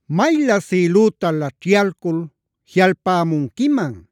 ¡Maylä sïlüta laćhyalcul jiꞌalpämunquiman!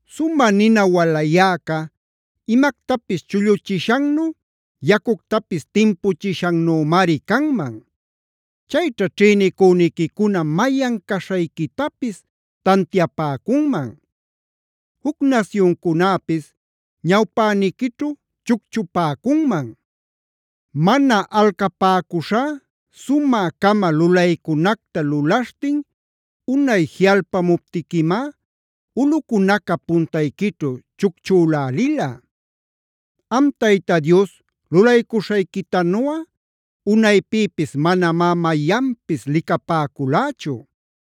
Sumä nina walayäca imactapis chulluchishannu, yacuctapis timpuchishannümari canman. Chayćha ćhïnicüniquicuna mayan caśhayquitapis tantiapäcunman; juc nasyuncunäpis ñawpäniquićhu chucchupäcunman. Mana alcapäcuśhá sumä-cama lulaycunacta lulaśhtin unay jiꞌalpämuptiquimá ulꞌucunaca puntayquićhu chucchülälila. Am Tayta Dios lulaycuśhayquitanuꞌa unaypïpis manamá mayanpis licapäculächu.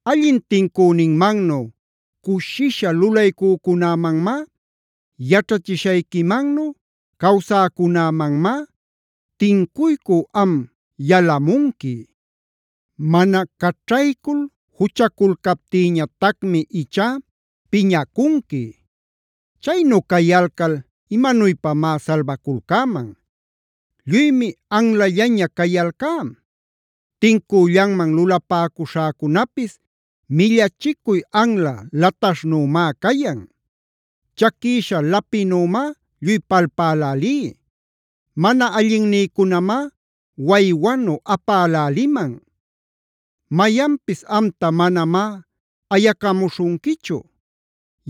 Allin tincüninmannu cushisha lulaycücunämanmá, yaćhachishayquimannu cawsäcunämanmá tincuycü am yalamunqui. Mana caćhaycul juchaculcaptïñatacmi ichá piñacunqui. Chaynu cayalcal ¿imanuypamá salbaculcäman? Lluymi anlallaña cayalcá; tincüllanman lulapäcuśhäcunapis millachicuy anla lataśhnümá cayan. Chaquïsha lapinümá lluy palpälälí; mana allinnïcunamá waywanu apäläliman. Mayanpis amta manamá ayacamuśhunquichu;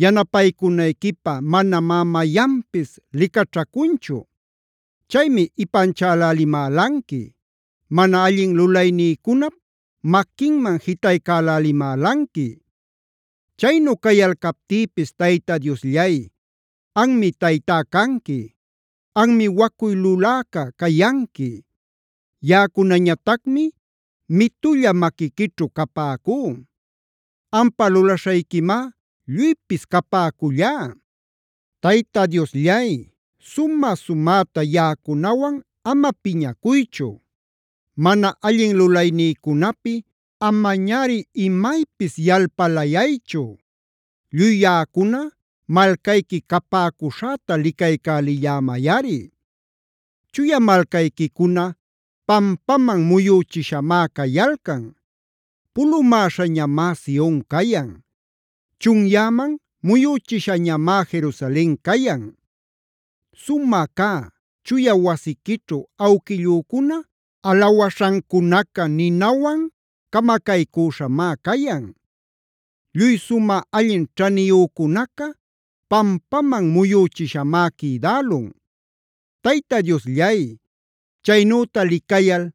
yanapaycunayquipä manamá mayanpis licaćhacunchu. Chaymi ipanchalälimälanqui; mana allin lulaynïcunap maquinman jitaycälälimälanqui. Chaynu cayalcaptïpis Tayta Diosllay, anmi Taytá canqui. Anmi wacuy luläca cayanqui; yaꞌacunañatacmi mitulla maquiquićhu capäcú.c Ampa lulaśhayquimá lluypis capäcullá. Tayta Diosllay, sumä-sumäta yaꞌacunawan ama piñacuychu; mana allin lulaynïcunapi amañari imaypis yalpalayaychu. Lluy yaꞌacuna malcayqui capäcuśhäta licaycälillämayꞌari. Chuya malcayquicuna pampaman muyüchishamá cayalcan. Pulumäśhañamá Sion cayan; chunyäman muyüchishañamá Jerusalen cayan. Sumä cä, chuya wasiquićhu awquillücuna alawaśhancunaca ninawan camacaycüśhamá cayan. Lluy sumä allin ćhaniyücunaca pampaman muyüchishamá quïdälun. Tayta Diosllay, chaynüta licayal,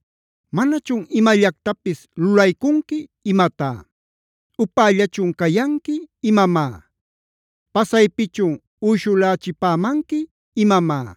¿manachun imallactapis lulaycunqui imatá? ¿Upällachun cayanqui imamá? ¿Pasaypichun uyshulächipämanqui imamá?